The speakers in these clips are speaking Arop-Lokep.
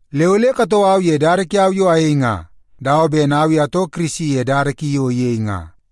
Le ole katoo au ye dada kiau yo ayei nga, dawa ben au i atoo Kirisi ye dada ki yo iyei nga.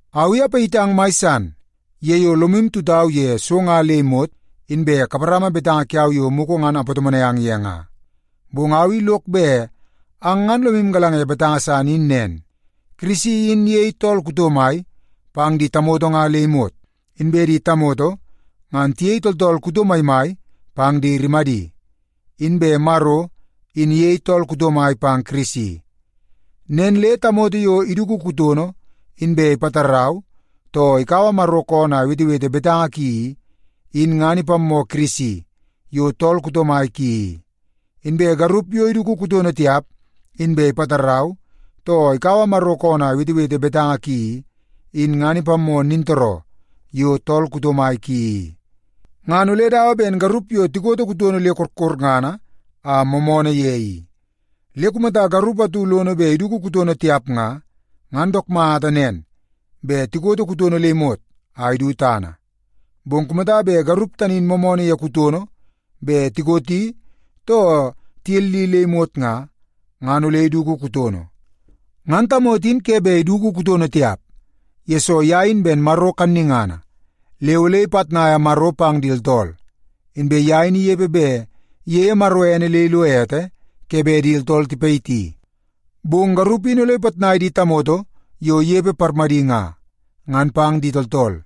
Au i apayitang mai san ye yo lomu tutau ye so nga le imot, inbe kaparama betanga kiau yo mugu ngan apatomonai ang ye nga. Bong au i lok bet ang ngan lomu galanga ye betanga san in nen. Kirisi in iyei tool kuto mai pang di tamoto nga le imot. Inbe di tamoto ngan tiyei tooltool kuto maimai pang di rimadi, inbe Maro in iyei tool kuto mai pang Kirisi. Nen le tamoto yo iduku kutono, inbe ipatarau, too ikaua Maro koonoo a iwetewete betanga ki i, in ngan ipammoo Kirisi yo tool kuto mai ki i. Inbe garup yo iduku kutono tiap, inbe ipatarau, too ikaua Maro koonoo a iwetewete betanga ki i, in ngan ipammoo nintooroo yo tool kuto mai ki i. Ngan ole dawa ben garup yo tikoto kutono le korkorngana a moomoonoo ye i. Le kumata garup atu lono bet iduku kutono tiap nga, ngan dook mata nen bet tikoto kutono le imot a idu tana. Bong kumata bet garup tani in moomoonoo ye kutono bet tikoti too tiyelli le imot nga, ngan ole iduku kutono. Ngan tamoto in ke bet iduku kutono tiap, yesoo ye in ben Maro kannungana le ole ipitnaia Maro pang di tooltool. Inbe ye in inepe bet iyeie Maro ene le ilo ete ke bet di tooltool tipayiti. Bong garup in ole ipitnai di tamoto yo inepe parmadi nga, ngan pang di tooltool.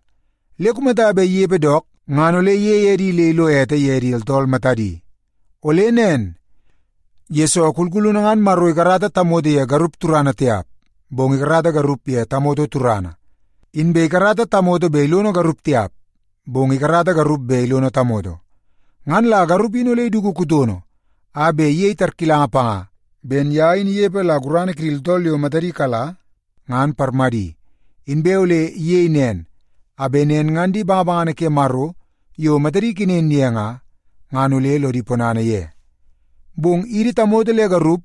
Le kumata bet inepe dook, ngan ole iyei edi le ilo ete ye di tooltool matadi. Ole nen, yesoo kulkulunu ngan Maro ikarata tamoto ye garup turana tiap, bong ikarata garup ye tamoto turana. Inbe ikarata tamoto bet ilono garup tiap, bong ikarata garup bet ilono tamoto. Ngan la garup in ole iduku kutono a bet iyei tarkilanga panga ben ye in inepe la gurana kidi tooltool yo matadi kala ngan parmadi. Inbe ole iyei nen, a bet nen ngan di bangabangana ke Maro yo matadi ikenen ye nga, ngan ole lodi ponana ye. Bong idi tamoto le garup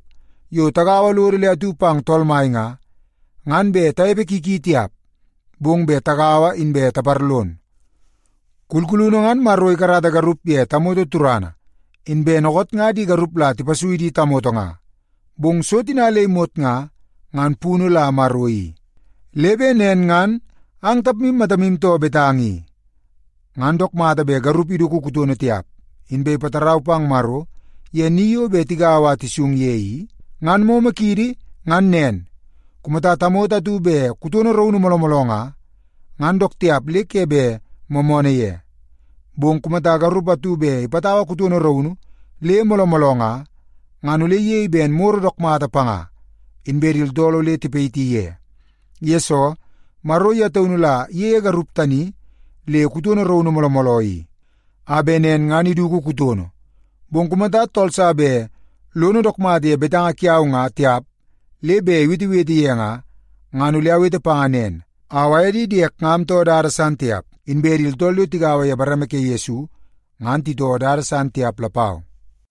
yo tagaua lodo le atu pang Tool Mai nga, ngan bet tanepe ki ki tiap, bong bet tagaua inbe taparlon. Kulkulunu ngan Maro ikarata garup ye tamoto turana. Inbe dookoot nga di garup la tipasui di tamoto nga. Bong so tina le imot nga, ngan punu la Maro i. Le bet nen ngan ang tapmu matamu too betanga i. Ngan dook mata bet garup iduku kutono tiap, inbe ipatarau pang Maro ye ni yo bet tigaua a tisung ye i? Ngan momo kiidi ngan nen, kumata tamoto atu bet kutono raunu mooloo mooloo nga, ngan dook tiap le ke bet moomoonoo ye. Bong kumata garup atu bet ipatau kutono raunu le mooloo mooloo nga, ngan ole iyei ben moro dook mata panga, inbe di tooltool ole tipayiti ye. Yesoo, Maro ye taunu la iyeie garup tani le kutono raunu mooloo mooloo i, a bet nen ngan iduku kutono. Bong kumata tool sa bet lono dook mata ye betanga kiau nga tiap le bet iwetewete ye nga, ngan ole awete panga nen. Au aye di diek nga amtoo dada san tiap, inbe di tooltool yo tigaua ye bareme ke Yesu nga, ngan titoo dada san tiap lapau.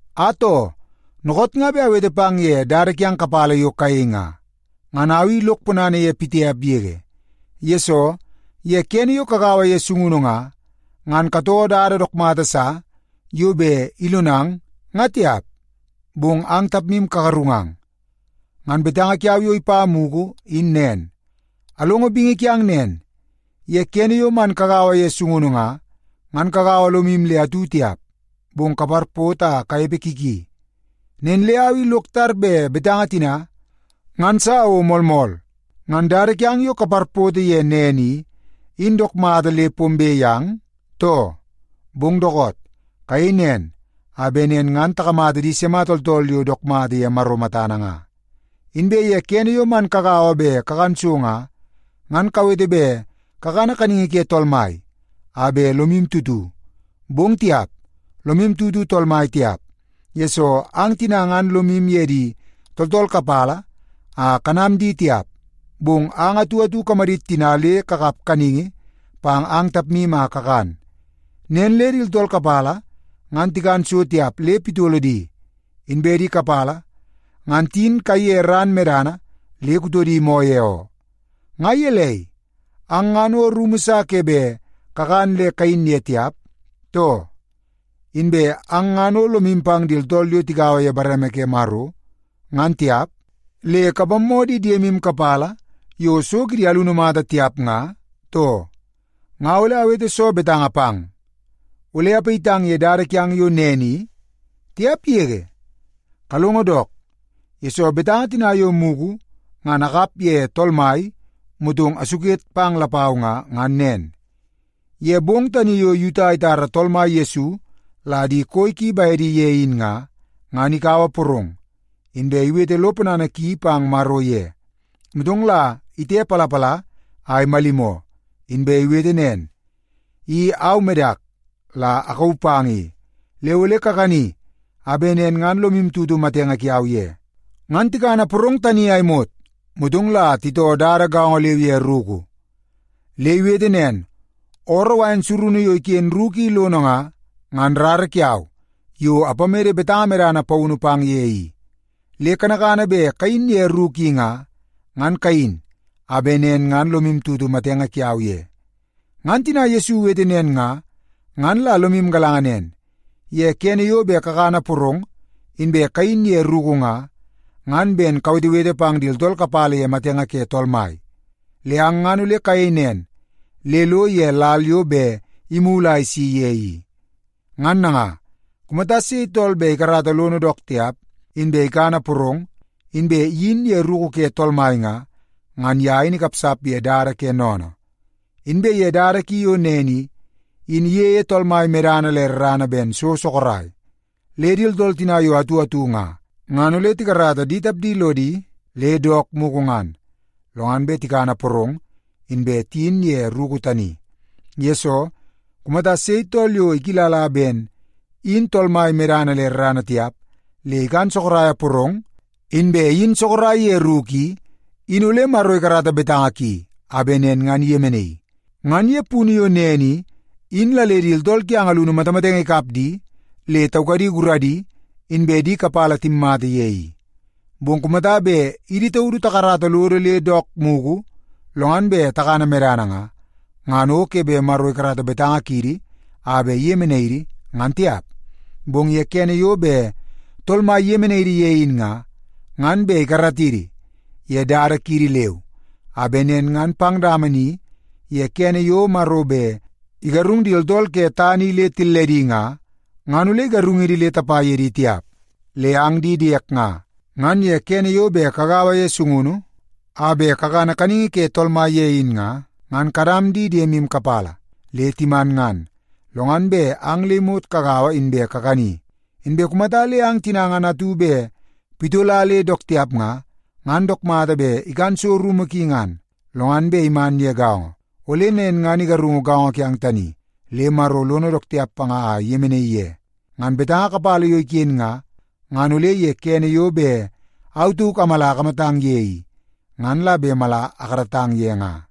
Atoo, dookoot nga bet awete pang ye dada kiang kapala yo kayei nga, ngan au i lok ponana ye pitiap yege. Yesoo, ye kene yo kagaua ye sungunu nga, ngan katoo dada dook mata sa yo bet ilonang nga tiap, bong ang tapmu kagarungang. Ngan betanga kiau yo ipa mugu in nen. Alongo bingi kiang nen, ye kene yo man kagaua ye sungunu nga, ngan kagaua lomu le atu tiap, bong kaparpoto a kanepe ki ki. Nen le au i lok tar bet betanga tina ngan sa o moolmool. Ngan dada kiang yo kaparpoto ye nen i, in dook mata le pombe yang, too? Bong dookoot, kayei nen a bet nen ngan takamata di sima tooltool yo dook mata ye Maro matana nga. Inbe ye kene yo man kagaua bet kakan so nga, ngan kawete bet kakana kaningi ke Tool Mai a bet lomu tutu. Bong tiap, lomu tutu Tool Mai tiap, yesoo ang tina ngan lomu ye di tooltool kapala a kanam di tiap, bong ang atu atu kamadit tina le kakap kaningi pang ang tapmu a kakan. Nen le di tooltool kapala ngan tikan so tiap le pitolo di, inbe di kapala ngan tiyin kaiye ran medana le kutodi moo ye oo. Nga gelei, ang ngan o rumu sa ke bet kakan le kayin ye tiap, too? Inbe ang ngan o lomu pang di tooltool yo tigaua ye bareme ke Maro ngan tiap, le kapammoo di diemu kapala yo so kidi alunu mata tiap nga, too? Nga ole awete soo betanga pang? Ole apayitang ye dada kiang yo nen i? Tiap yege! Kalongo dook, yesoo betanga tina yo mugu ngan akap ye Tool Mai motong asuket pang lapau nga, ngan nen. Ye bong tani yo Yuta itara Tool Mai Yesu la di koi ki bedi ye in nga, ngan ikaua porong, inbe iwete lo ponana ki pang Maro ye. Motong la itepalapala a imalimoo, inbe iwete nen, “I au medak la akauu pang i. Le ole kakani a bet nen ngan lomu tutu matenge kiau ye.” Ngan tikana porong tani a imot, motong la itoo dada gaongo leu ye ruku. Le iwete nen, “Ooroo wain surunu yo iken ruku i lono nga, ngan rara kiau yo apamede betanga medana paunu pang ye i. Le kanakana bet kayin ye ruku i nga, ngan kayin a bet nen ngan lomu tutu matenge kiau ye.” Ngan tina Yesu iwete nen nga, ngan la lomu galanga nen: Ye kene yo bet kakana porong, inbe kayin ye ruku nga, ngan ben kawetewete pang di tooltool kapala ye matenge ke Tool Mai. Le ang ngan ole kayei nen le ilo ye lal yo bet imulu a isi ye i. Ngan nanga, kumata sei tool bet ikarata lono dook tiap, inbe ikana porong, inbe iyin ye ruku ke Tool Mai nga, ngan ye in ikapsap ye dada ke sennene. Inbe ye dada ki yo nen i, in iyeie Tool Mai medana le rarana ben so sorok. Le di tooltool tina yo atu atu nga, ngan ole tikarata di tapdi lodi le dook mugu ngan, lo ngan bet tikana porong, inbe tiyin ye ruku tani. Yesoo, kumata sei tool yo ikilla ben in Tool Mai medana le rarana tiap, le ikan sorok porong, inbe iyin sorok ye ruku i, in ole Maro ikarata betanga ki a bet nen ngan iyemenaii. Ngan ye punu yo nen i, in la le di tooltool kiang alunu matamatenge ikap di le taukadi guradi, inbe di kapala timmata ye i. Bong kumata bet idi taudu takarata lodo le dook mugu, lo ngan bet takana medana nga, ngan o ke bet Maro ikarata betanga kiidi a bet nen ngan iyemenai idi ye, ngan tiap. Bong ye kene yo bet Tool Mai iyemenai idi ye in nga, ngan bet ikaratidi ye dada kiidi leu, a bet nen ngan pang dama ni ye kene yo Maro bet igarung di tooltool ke tana i le tilledi nga, ngan ole igarungidi le tapa ye di tiap. Le ang di diek nga, ngan ye kene yo bet kagaua ye sungunu a bet kakana kaningi ke Tool Mai ye in nga, ngan kanam di diemu kapala le timan ngan, lo ngan bet ang le imot kagaua inbe kakani. Inbe kumata le ang tina ngan atu bet pitola le dook tiap nga, ngan dook mata bet ikan so rumu ki ngan, lo ngan bet iman ye gaongo. Ole nen ngan igarungu gaongo kiang tani, le Maro lono dook tiap panga a iyemenaii ye. Ngan betanga kapala yo iken nga, ngan ole ye kene yo bet au tauk amala akamatang ye i, ngan la bet mala akaratang ye nga.